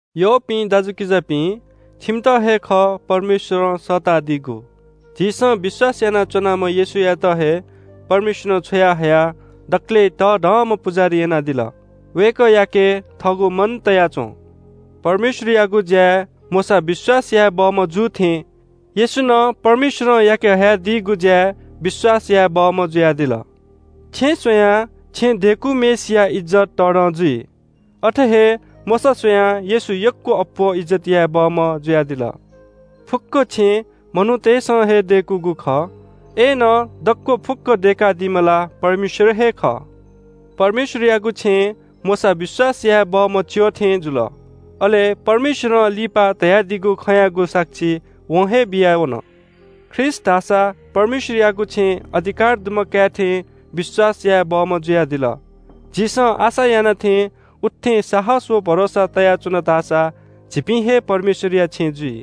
यःपिं दाजुकिजापिं, छिमित हे खः, परमेश्‍वरं सःतादीगु। झीसं विश्‍वास यानाच्‍वनाम्‍ह येशूयात हे परमेश्‍वरं छ्वयाहयाः दकलय् तःधंम्‍ह पुजाहारी यानादिल। वय्‌कःयाके थःगु मन तया च्‍वँ। परमेश्‍वरयागु ज्‍याय् मोशा विश्‍वास याये बहःम्‍ह जू थें, येशू नं परमेश्‍वरं याके हयादीगु ज्‍याय् विश्‍वास याये बहःम्‍ह जुयादिल। छेँ स्‍वयाः छेँ दय्‌कूम्‍हय्‌सिया इज्‍जत तःधं जुइ। अथे हे मोशा स्‍वयाः येशू यक्‍व अप्‍वः इज्‍जत याये बहःम्‍ह जुयादिल। फुक्‍क छेँ मनूतय्‌सं हे दय्‌कूगु खः। अय्‌नं दक्‍व फुक्‍कं दय्‌कादीम्‍ह ला परमेश्‍वर हे खः। परमेश्‍वरयागु छेँय् मोशा विश्‍वास याये बहःम्‍ह च्‍यः थें जुल। अले परमेश्‍वरं लिपा धयादीगु खँयागु साक्षी वं हे बियावन। ख्रीष्‍ट धाःसा परमेश्‍वरयागु छेँय् अधिकार दुम्‍ह काय् थें विश्‍वास याये बहःम्‍ह जुयादिल। झीसं आशा याना थें उत्‍थें साहस व भरोसा तयाच्‍वन धाःसा झीपिं हे परमेश्‍वरया छेँ जुइ।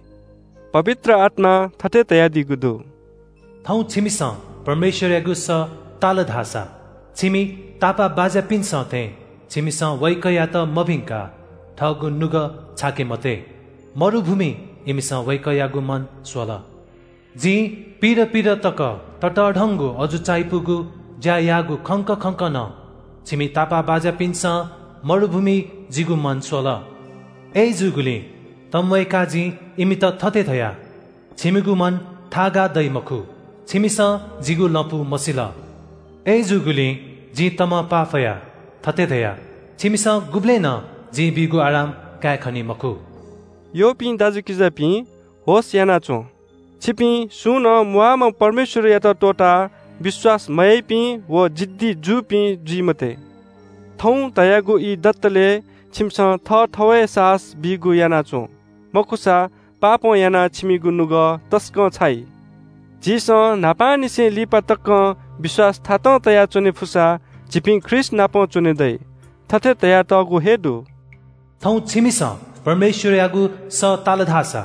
पवित्र आत्‍मां थथे धयादीगु दु – “थौं छिमिसं परमेश्‍वरयागु सः ताल धाःसा, छिमि तापाःबाज्‍यापिन्‍सं थें छिमिसं वय्‌कःयात मभिंकाः थःगु नुगः छाके मते। मरुभूमिइ इमिसं वय्‌कःयागु मन स्‍वल। जिं पिइदँ पिइदँ तक ततःधंगु अजू चायापुगु ज्‍या याःगु खंक खंक नं छिमि तापाःबाज्‍यापिन्‍सं मरुभूमिइ जिगु मन स्‍वल। अय्‌जूगुलिं तंम्‍वय्‌काः जिं इमित थथे धया – ‘छिमिगु मन थाःगाः दइ मखु, छिमिसं जिगु लँपु मसिल।’ अय्‌जूगुलिं जिं तमं पाफयाः थथे धया – ‘छिमिसं गुबलें नं जिं बीगु आराम काये खनी मखु।’” यःपिं दाजुकिजापिं, होश‍ यानाच्‍वँ। छिपिं सुं नं म्‍वाःम्‍ह परमेश्‍वरयात त्‍वःताः विश्‍वास मयाइपिं व जिद्दी जूपिं जुइ मते। “थौं” धयागु ई दतले छिमिसं थःथवय् साहस बीगु याना च्‍वँ। मखुसा पापं यानाः छिमिगु नुगः तसकं छाइ। झीसं न्‍हापांनिसें लिपा तकं विश्‍वास थातं तयाच्‍वने फुसा झीपिं ख्रीष्‍टनापं च्‍वने दइ। थथे धयातःगु हे दु – “थौं छिमिसं परमेश्‍वरयागु सः ताल धाःसा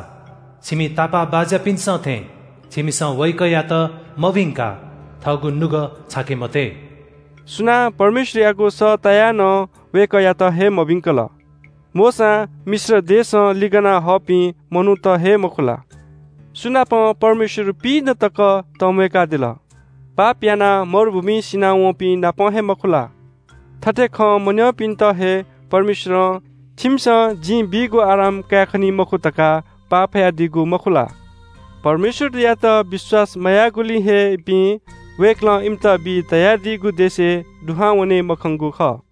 छिमि तापाःबाज्‍यापिन्‍सं थें छिमिसं वय्‌कःयात मभिंकाः थःगु नुगः छाके मते।” सुनां परमेश्‍वरयागु सः तायाः नं वय्‌कःयात हे मभिंकल? मोशां मिश्र देशं लिगनाहःपिं मनूत हे, मखु ला? सु नाप परमेश्‍वर पिइदँ तक तंम्‍वय्‌कादिल? पाप यानाः मरुभूमिइ सिनावंपिं नाप हे, मखु ला? थथे खँ मन्‍यंपिन्‍त हे परमेश्‍वरं “छिमिसं जिं बीगु आराम कायेखनी मखु” धकाः पाफयादीगु, मखु ला? परमेश्‍वरयात विश्‍वास मयाःगुलिं हे इपिं वय्‌कलं इमित बी धयादीगु देशय् दुहां वने मखंगु खः।